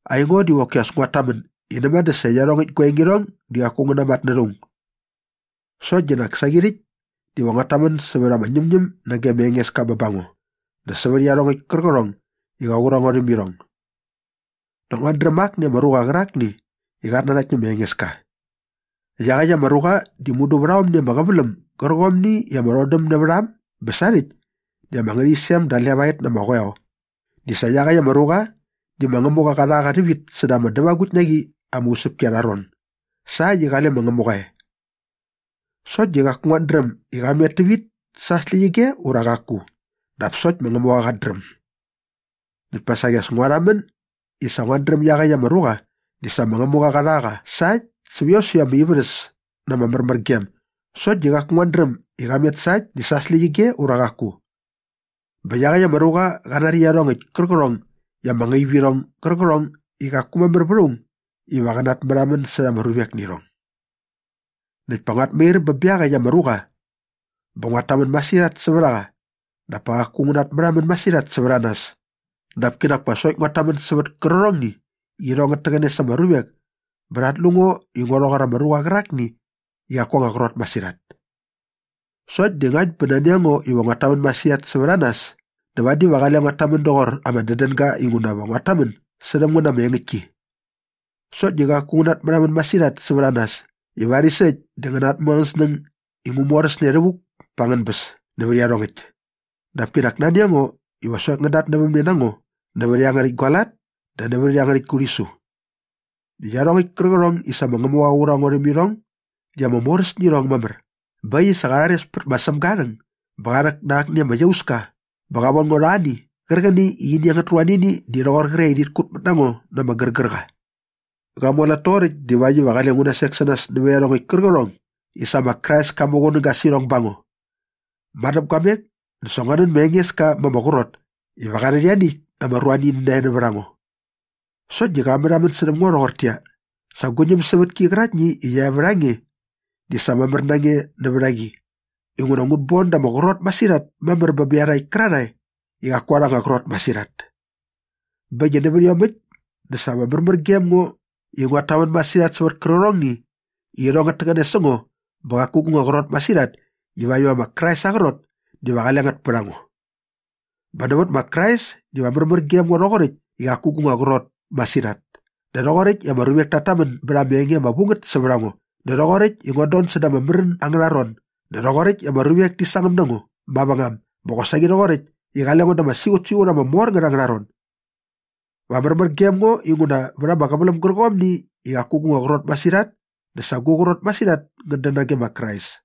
Aingo diva qoki as nguat tamän i näma dä sa iangärhäkt gua enge di qaku ngä namatnärha aung. Sokt di nak saqi rhäkt diva nguat tamän sävät ama ñämñäm nage ma Engeska bä ba ngo dä sävät iarhongäkt kärqärhong i qa qur a ngo rhäm irhong. Näkt nguat dräm akni ama ruqa qärakni i qat nanakt nä ma Engeska. Iaqäkt ama ruqa di mudu vät aomni ama qäväläm gärqomni i ama rhodäm nävät a äm bä sarhäkt di ama ngärhäqyisem da levaet na ama qoeo di sa iaqäkt ama ruqa di ma Ngämuqa qa rha qa rhävit säda ama dävagukt na qi ama usäpki arha ron sa äkt i qale ma Ngämuqa e. Sokt di qaku nguat dräm i qa met tävit sa aa släqyige ura qaku dap sokt ma Ngämuqa qat dräm. Näkt pa saqi as ngua rhamän i sa nguat dräm i iaqäkt ama ruqa di sa ma Ngämuqa qa rha qa sa äkt säva ama ivärhäs na ama märmärgem sokt di qaku nguat dräm i qa met sa äkt di sa aa släqyige ura qaku. Bä iaqäkt ama ruqa qa nari iarhongäkt kärqärhong i ama ngaip irhong gärqärhong i qaku mamär vät aung iva qä natmärhamän särha ama ruvek nä irhong. Näkt pa nguat mair bä bä iaqäkt ama ruqa bä nguat tamän masirhat sävät a qa dap pa qaku ngu natmärhamän masirhat sävät a nas dap kinak pa sokt nguat tamän sävät kärqärhongni i irhong ngät täqäne sa ama ruvek bä rhat lu ngo i ngo rhoqor ama ruqa qärakni i qaku aa anga qrot masirhat. Sokt di ngakt bä nani a ngo iva nguat tamän masirhat sävät a nas dä vadi va qale nguat tamän doqor ama dädänga inguna va nguat tamän särhäm ngän na ama engäktki. Sokt di qaku ngu natmärhamän masirhat sävät a nas i varis äkt dä ngän natmu angän snäng i ngu moräsne rhävuk pa angän bäs nävät iarhongäkt. Dap kinak nani a ngo iva sokt ngän datnävämne na ngo nävät iangärhäkt gua lat dä nävät iangärhäkt gu rhisu. Näkt iarhongäkt kärqärhong i sa ma Ngämuqa qa qur a ngo rhäm irhong di ama moräs nä irhong mamär bä äkt i sa qa rhares pät ma Sämga aa rhäng bä qa rhäk na akni ama iauska bä qa von ngo rha ani qärqäni i ini angät ruanini di rhoqor qre i rhit kut mät na ngo na ama gärgärqa. Qa mualat toqoräkt divakt iva qale ngu nasek sä nas nävät iarhongäkt kärqärhong i sa ma Krais ka muqunäga sä irhong ba ngo. Madäpguamek dä sa ngua nän ma Engeska ma ama qrot iva qa rhät ianiäkt ama ruanini nae nävät a ngo. Sokt di qa märhamän särhäm ngo rhoqortäqyia, “Sa gu ñämsävätki qäraktni i qia e vät a nge di sa mamär na nge nävät a qi inguna ngut bon da ama qrot masirhat mamär bä bä iarhakt kärarhae i qaku arha anga qrot masirhat.” Bä äkt i nävät iomäkt dä sa va märmär gem ngo i nguat tamän masirhat sävät kärqärhongni i irhong ngät täqäne sä ngo bä qaku gu nga qrot masirhat ivakt iva ma Krais aa qrot diva qale ngät pät a ngo. Bä nävät ma Krais diva märmär gem ngo rhoqoräkt i qaku gu nga qrot masirhat dä rhoqoräkt i ama ruvek tat tamän bät ama enge ama vu ngät sävät a ngo dä rhoqoräkt i nguat don säda ama märän angärha ron dä rhoqoräkt i ama ruvek ti sangäm na ngo mavängam bä qosaqi rhoqoräkt i qale ngo da ama siqutsiqut ama mor ngät angärha ron. Va märmär gem ngo inguna vät ama qäväläm gärqomni i qaku gu nga qrot masirhat dä sa gu qrot masirhat ngät dän nage ma Krais.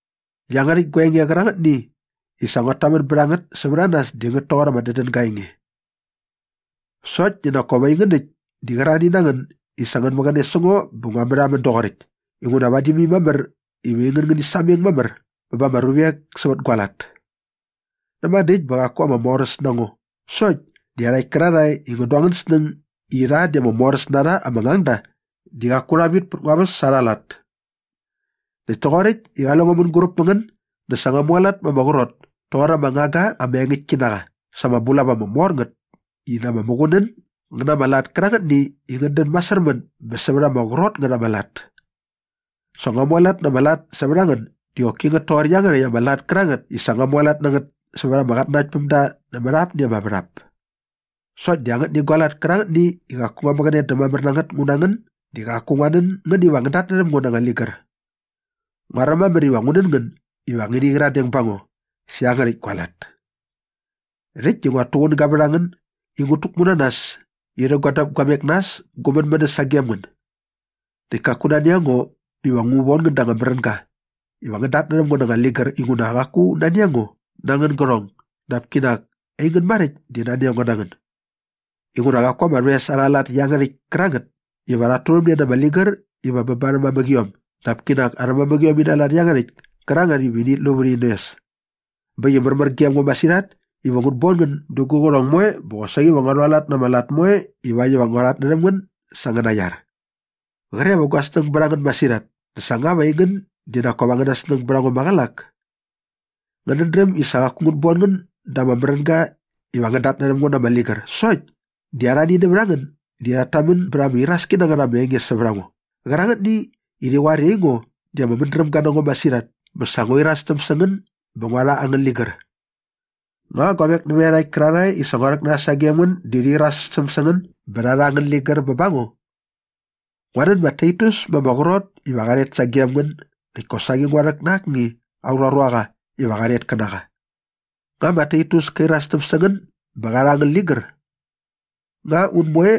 Iangärhäkt gua enge qärangätni i sa nguat tamän bät a ngät sävät a nas di ngät toqor ama dädänga aa enge. Sokt di nak kop aingän äkt di qärarhani na ngän i sa ngän mäqäne sä ngo bä ngua märhamän doqoräkt inguna vadi mai mamär iva ngäni sameng mamär bä ba ama ruvek sävät gua lat. Näma dä äkt bä qaku ama moräs na ngo sokt di iarhakt kärarhae i ngän du angän snäng i rha di ama moräs na rha ama ngangda di qaku rha vit pät ngua väs sa arha lat. Näkt toqoräkt i qale ngo mänguräp mä ngän dä sa ngua mualat ma ama qrot toqor ama ngangga ama engäktki na qa sa ama bulap ama mor ngät i na ama muqunän ngä na ama lat kärangätni i ngät dän masärmän bä sävät ama qrot ngät ama lat. Sa ngua mualat na ama lat sävät a ngän di qoki ngät toqor iangärhäkt ama lat kärangätni i sa ut mualat na ngät sävät ama qatnanaktpämda nämät apni ama värhap. Sokt di angätni gua lat kärangätni i qaku ngua mäqäne dä mamär na ngät ngu na ngän di qaku ngua nän ngän iva ngän datnärhäm ngo na anga ligär. Nguaräm mamär iva ngu nän iva ngäni qyiradeng ba ngo sä iangärhäkt gua lat. Rhäkt di nguat tuqunäga vät a ngän i ngut täkmu na nas irhä gua däpguamek na äs gu mänmänäs sagem ngän. Näkt kaku nani a ngo iva ngu von ngän da anga märänga iva ngän datnärhäm ngo na anga ligär inguna qaku nani a ngo na angän gärhong dap kinak aingän maräkt di nani a ngo na ngän. Inguna qaku ama rhoes arha lat iangärhäkt kärangätni iva rhat turhämne na ama ligär iva bä ba arhä mamäqiom dap kinak arhä mamäqiom ina lat iangärhäkt kärangätni iva init lu vät in oes. Bä äkt i märmär gem ngo masirhat iva ngut bon ngän dä gu qärhong moe bä qosaqi va ngua rhualat na ama lat moe ivakt iva ngua rhatnärhäm ngän sä angäna iar. Qre va gua snäng bät a ngän masirhat dä sa nga va aingän di nak kop angäna snäng bät a ngo maqälak? Ngänät dräm i sa qaku ngut bon ngän da ama märänga iva ngän datnärhäm ngo na ama ligär sokt di arhani nävät a ngän di rhat tamän bät ama iraski na ngät ama enge sävät a ngo qärangätni i rhi qoar i aingo di ama mädrämga na ngo masirhat bä sa ngua irastäm sä ngän bä ngua rha angän ligär. Nga guavek nävät iarhakt kärarhae i sa ngua rhäk na rha sagem ngän di irastäm sä ngän bä rha rha angän ligär bä ba ngo? Ngua nän ma Taitus ma ama qrot iva qa rhet sagem ngän näkt kosaqi ngua rhäk na akni aurha ruaqa iva qa rhet kä na qa. Nga ma Taitus ka irastäm sä ngän bä qa rha angän ligär? Nga un moe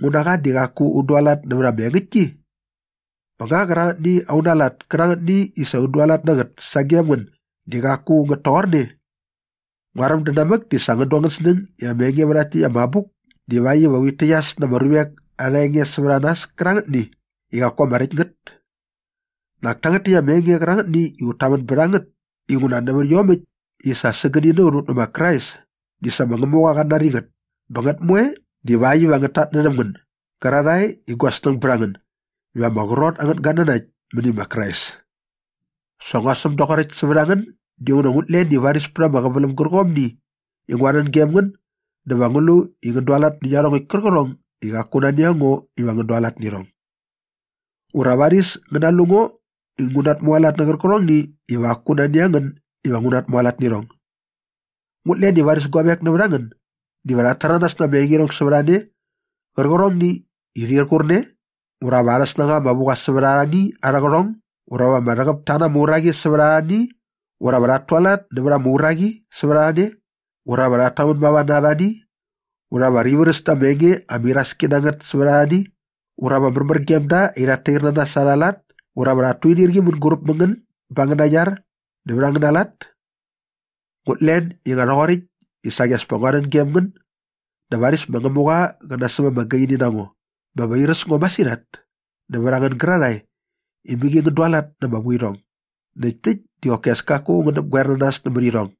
ngu na qa di qaku un dualat nävät ama engäktki? Bä nga qärangätni auna lat kärangätni i sa un dualat na ngät sagem ngän di qaku ngät toqorne? Nguaräm dä namäk di sa ngän du angän snäng i ama enge vä rhakt täkt gua abuk divakt iva urhit täqyas na ama ruvek arha enge sävät a nas kärangätni i qaku ama räkt ngät. Nak tangät täkt ama enge qärangätni i ut tamän bät a ngät inguna nävät iomäkt i sa sägäni na ut ut nä ma Krais di sa ma Ngämuqa qat nari ngät bä ngät moe divakt iva ngät tatnärhäm ngän gärarhae i gua snäng bät a ngän iva ama qrot angän gatnanakt mäni ma Krais. Sa ngua säm doqoräkt sävät a ngän dinguna ngut len i varis pät ama qäväläm gärqomni i ngua rhän gem ngän dä va ngu lu i ngän dualat nä iarhongäkt kärqärhong i qaku nani a ngo iva ngän dualat nä irhong. Ura varis ngän nalu ngo i ngu natmualat nä qärqärhongni iva qaku nani a ngän iva nguat tualat nä irhong. Ngut len i varis guavek nävät a ngän diva rhat täranas na ama engirhong sävät a ne qärqärhongni i rhir qur ne ura va arha anga snängaqa anga vu qa sävät arhani arhä qärhong ura va rhäqäp ta na ama uraqi sävät arhani ura va rhat tualat nävät ama uraqi sävät a ne ura va rhat tamän mava na arhani ura va rhi vräs da ama enge ama iraski na ngät sävät arhani ura va märmär gem da i rhat tair na nas sa arha lat ura va rhat tuinirqi mänguräp mä ngän bät angäna iar dä vät angäna lat. Ngut len i nga rhoqoräkt i saqi as pa ngua rhän gem ngän dä varis ma Ngämuqa qä nasäm ama gaini na ngo bä va airäs ngo masirhat nävät a ngän gärarhae i mäqi ngän dualat na ama vuirhong näkt täkt di qoki as kaku ngän näpgoer na nas nämät irhong.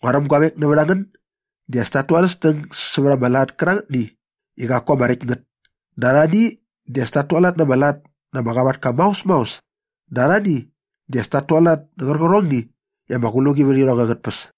Nguaräm guavek nävät a ngän di as tat tu arhä snäng sävät ama lat kärangätni i qaku ama räkt ngät dä arhani di as tat tualat na ama lat na ama qavatka maos maos dä arhani di as tat tualat nä qärqärhongni i ama qluqi vät irhong angät tpäs.